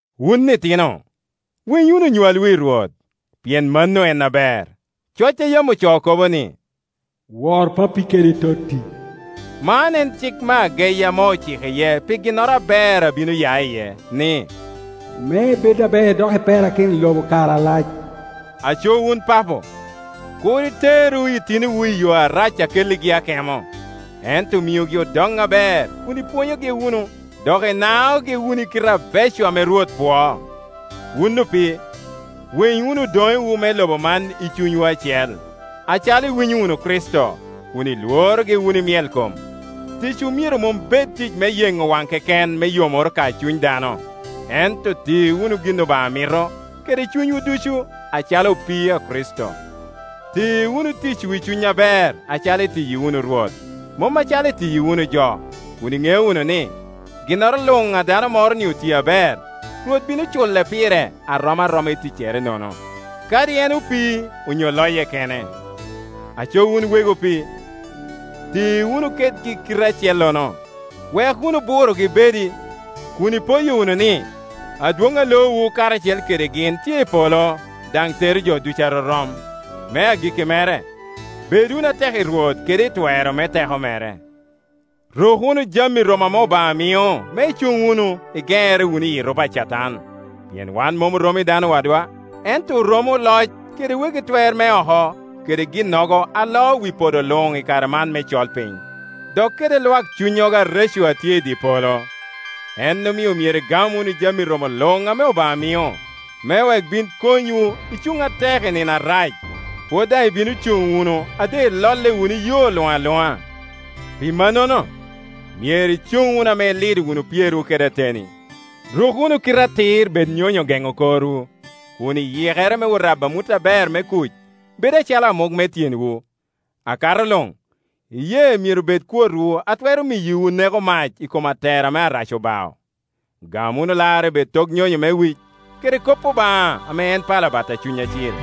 Wun itino, winy wunu onywalwu i Rwot, pien mano en aber. Coc a yam ocoo kobo ni, “Wor pappi kede totti,” man en cik me ageyi ame ociko iye pi ginnoro aber a bino ya iye, ni, “me ibed aber dok iperakino i lobo kare alac.” Aco wun papo, kur iteru itinowu i yo arac a kelligi akemo, ento miugi odoŋ aber kun ipwonyogi wunu dok inaogi wunu i kite abeco ame Rwot pwoo. Wun opii, winy wunu odoŋewu me lobo man i cunywu acel, acalo iwinyo wunu Kricito, kun ilworogi wunu i myelkom. Ticwu myero mom bed tic me yeŋo waŋ keken me yomoro ka cuny dano, ento ti wunu gin Obaŋa mito kede cunywu ducu, acalo opii a Kricito. Ti wunu ticwu i cuny aber, acalo itiyi wunu Rwot, mom acalo itiyi wunu jo, kun iŋeo wunu ni, ginnoro luŋ a dano moro otio aber, Rwot bino cule pire a rom aroma i ticcere-nono, kadi en opii onyo loye kene. Aco wun wegi opii, ti wunu kedgi kite acellono, wek wunu burogi bedi, kun ipoyo wunu ni, adwoŋ a loowu karacel kede gin tye i polo, daŋ tero jo ducu arorom. Me agikki mere, bed wunu atek i Rwot kede i twero me teko mere. Ruk wunu jami romo ame Obaŋa mio, me icuŋ wunu, igeŋere wunu iyi erupe a Catan. Pien wan mom oromo i dano wadwa, ento oromo oloc kede wegi twer me oko, kede ginnogo a loo wi podo luŋ i kare man me colpiny, dok kede lwak cunnyogo areco a tye i dye polo. En omio myero igam wunu jami romo luŋ ame Obaŋa mio, me wek bin konywu i cuŋ atek i nino arac, pwod daŋ ibino cuŋ wunu a doŋ ilolle wunu i yo luŋ aluŋa. Pi mannono, myero icuŋ wunu ame ilido wunu pyerwu kede ateni; ruk wunu kite atir bed nyonyo geŋo korwu, kun yikerewu me rabo amut aber me kuc bedo acalo amuk me tyenwu. Akato luŋ, iyee myero bed kwotwu a twero miyowu neko mac i kom atero ame Arac obao. Gam wunu larre bed tok nyonyo me wic, kede kop Obaŋa ame en pala bat a Cuny Acil.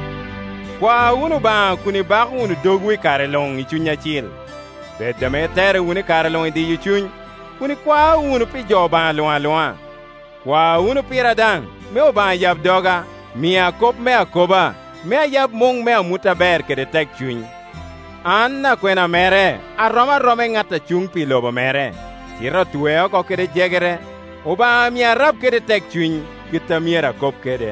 Kwa wunu Obaŋa kun ibako wunu dogwu i kare luŋ i Cuny Acil. Bed ame iterre wunu i kare luŋ i diyo cuny, kun ikwao wunu pi jo Obaŋa luŋ aluŋa. Kwa wunu pira daŋ me Obaŋa yab doga, mia kop me akoba, me ayab muŋ me amut aber kede tekcuny. An akwena mere a rom aroma i ŋat a cuŋ pi lobo mere, cite otwea oko kede jegere. Obaŋa mia arab kede tekcuny, kit a myero akob kede.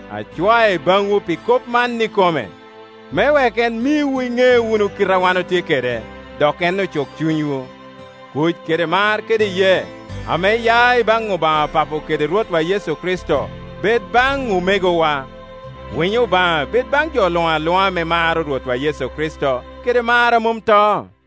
Acwae baŋwu pi kop man ikome, me wek en miwu iŋe wunu kite a wan otye kede, dok en ocuk cunywu. Kuc kede mar kede iyee ame ya i baŋ Obaŋa Pa po kede Rwotwa Yecu Kricito bed baŋ omegowa. Winyo Obaŋa bed baŋ jo luŋ aluŋa ame maro Rwotwa Yecu Kricito kede mar a mom to.